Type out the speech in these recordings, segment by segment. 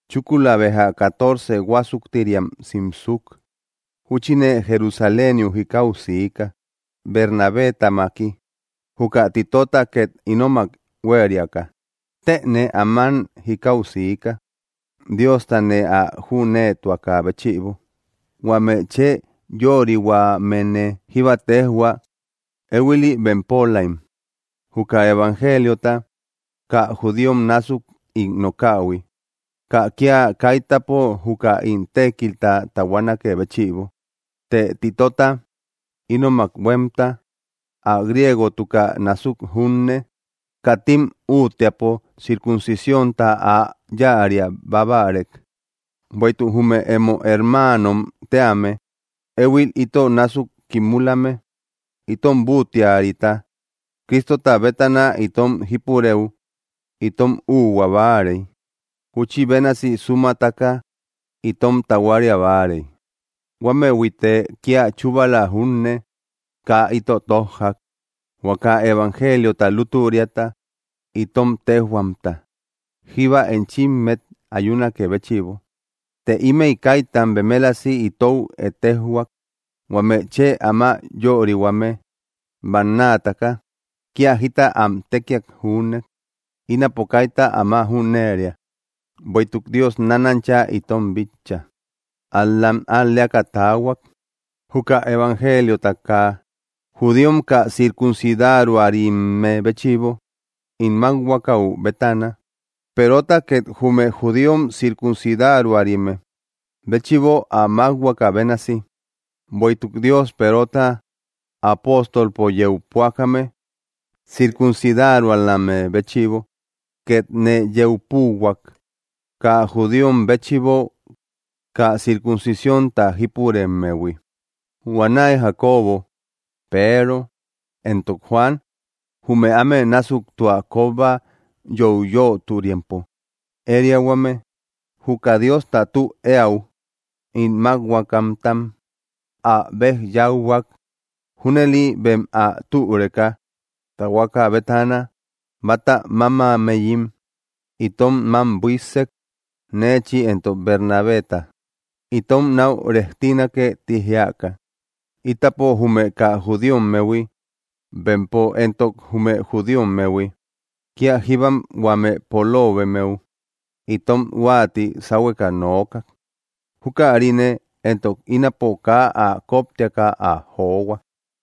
Chúkula béja catorce huásuktiriam simsuk, júchine Jerusaléniu jikau siika Bernabétamaki, juka Titota két ínomak huériaka. Tëne áman jikau siika Diosta nee ä jüneetuakä béchïbo. Huame chë yörihuamene jíba téjhuak éhuili bempölaim, juka evangeliota, kaa judíom násuk ín nokähui, kaa kía kaitäpo juka ín tékilta tahuanakë béchïbo. Të Titota, ínomak huémta, ä griegotukä násuk junne, katim útteapo circuncisiónta ä yáaria bábarek. Bueïtuk, jume emo hermaanom tíame éhuil ito násuk kimulame, itom búttiarita Cristota bétana itom jípurëu itom úuhua báarey, júchi bénasi sumataka itom tahuaria báarei. Huámëhuïte kía chúbala júne kaa ito tójjak, huaka evangeliota lútüriata itom téjhuamta jíba enchimmet ayunakë béchïbo. Të ímëi kaitam bemelasi itou ettejhuak huame chë áma yörihuame bannaataka kía jita am tékiak júne; ínapo kaita áma jüneria, bueïtuk Dios nánancha itom bitcha. Ál‑lam al‑leaka taahuak, juka evangeliota kaa judíom kaa circuncidaruarimme béchïbo ín mákhuakau bétana, Perota két jume judíom circuncidaruarime béchïbo ä mákhuaka bénasi. Bueïtuk Dios Perota apóstolpo yeu púakame circuncidarualamme béchïbo, két nee yeu púuhuak kaa judíom béchïbo kaa circuncionta jípuremmehui. Huanäi, Jacobo, Peero, éntok Juan, jume áme násuk tua kóba yoiyöturimpo ériahuame, juka Diosta tü eäu ín mákhuakamtam ä bej yauhuak junëli bem ä türeka tahuaka bétana báta mámammeyim itom mám buíssek neechi éntok Bernabéta. Itom náu rejtinake ti jiaka, itapo jume kaa judíommehui, bempo éntok jume judíommehui. Kía jíbam huame poloobemmeu itom huáati sáhueka nookak. Jukarine entok ínapo kaa ä koptiaka ä johua.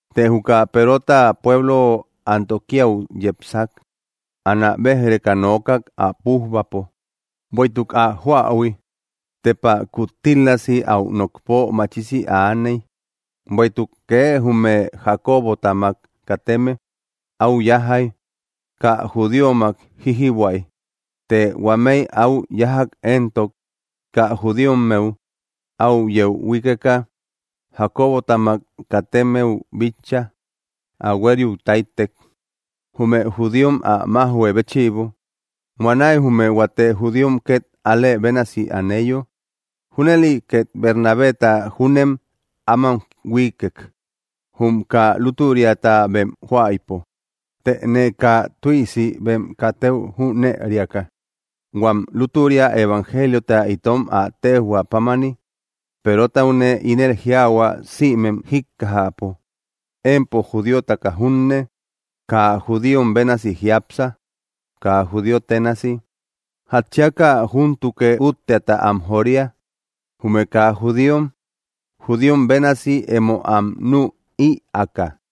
Të juka Perota pueblo Antioquíau yepsak, anä béj‑reka nookak ä pújbapo, bueïtuk ä joähui tepa kuttílasi áu nokpo machisi aaney. Bueïtuk kee jume Jacobotamak kateme áu yájjay, kaa judíommak jíjïbuäy, të huamei áu yájak éntok kaa judíommeu áu yeu huíkeka Jacobotamak katemmeu bíchaa ä huérïu táytek, jume judíom ä májhuë béchïbo. Huanäi jume huate judíom két alë bénasi aneyo. Júnëli két Bernabéta júnem aman huíkkek, jum kaa lútüriata bem joaïpo. Tëne kaa tüisi bem katëu jünë eriaka, huam lútüria evangeliota itom ä téjhua pámani, Perotaune ínel jiaahua sïmem jíkkajäpo: “Empo judíotaka junne, kaa judíom bénasi jiápsa, kaa judío ténasi. ¿Jatchiaka júntukë útteata am joria, jume kaa judíom, judíom bénasi emo am nü ïaaka?”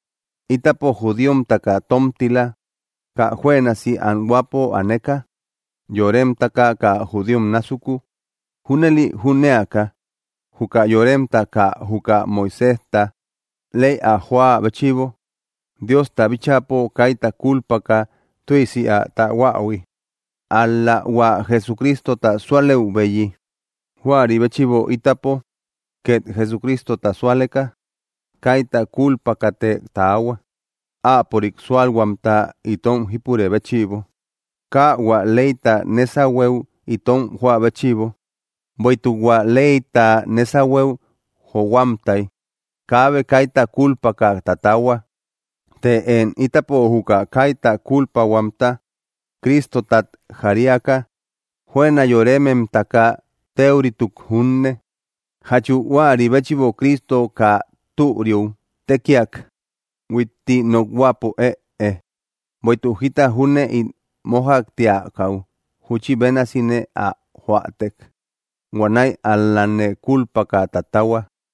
Ítapo judíomtaka tómtila, kaa juënasi anhuäpo aneka yóremtaka kaa judíom násuku. Júnëli jünéaka, juka yoremta kaa juka Moiséjta ley ä joä béchïbo Diosta bíchäpo kaita kúlpaka tüisi ä tahuähui, ál‑la hua Jesucristota súalëubeyi. Juäri béchïbo ítapo két Jesucristota súaleka kaita kúlpakate taahua, áapörik súalhuamta itom jípurë béchïbo, kaa hua leyta nésahueu itom joä béchïbo, bueïtuk hua leyta nésahueu johuamtay kaabe kaita kúlpaka tatahua. Të én, ítapo juka kaita kúlpahuamta Cristotat jariaka, juëna yórememtaka téurituk junne, ¿jachu huäri béchïbo Cristo kaa türiu tékiak? ¡Huitti nokhuäpo, ëe! Bueïtuk jita júne ín mójaktiakäu júchi bénasine ä joätek, huanäi ál-lane kulpaka tatahua.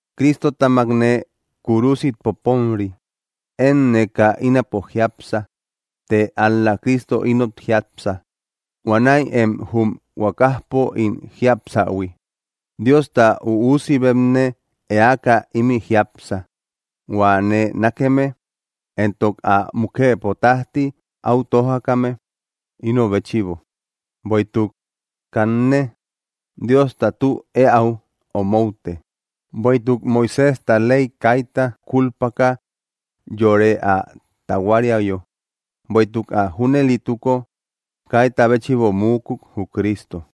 Cristotamakne kúrusit poponri. Énne kaa ínapo jiápsa, të ál‑la Cristo ínot jiápsa. Huanäi én jum huakajpo ín jiapsähui. Diosta üusibetne eaka imï jiápsa, hua nee nákeme, éntok ä mukëpo tájti áu tójakame, ino béchïbo. Bueïtuk, kanne, Diosta tü eäu omoute; bueïtuk Moiséjta ley kaita kúlpaka yore ä tahuariayo, bueïtuk ä junëlituko, kaita béchïbo muukuk, jü Cristo.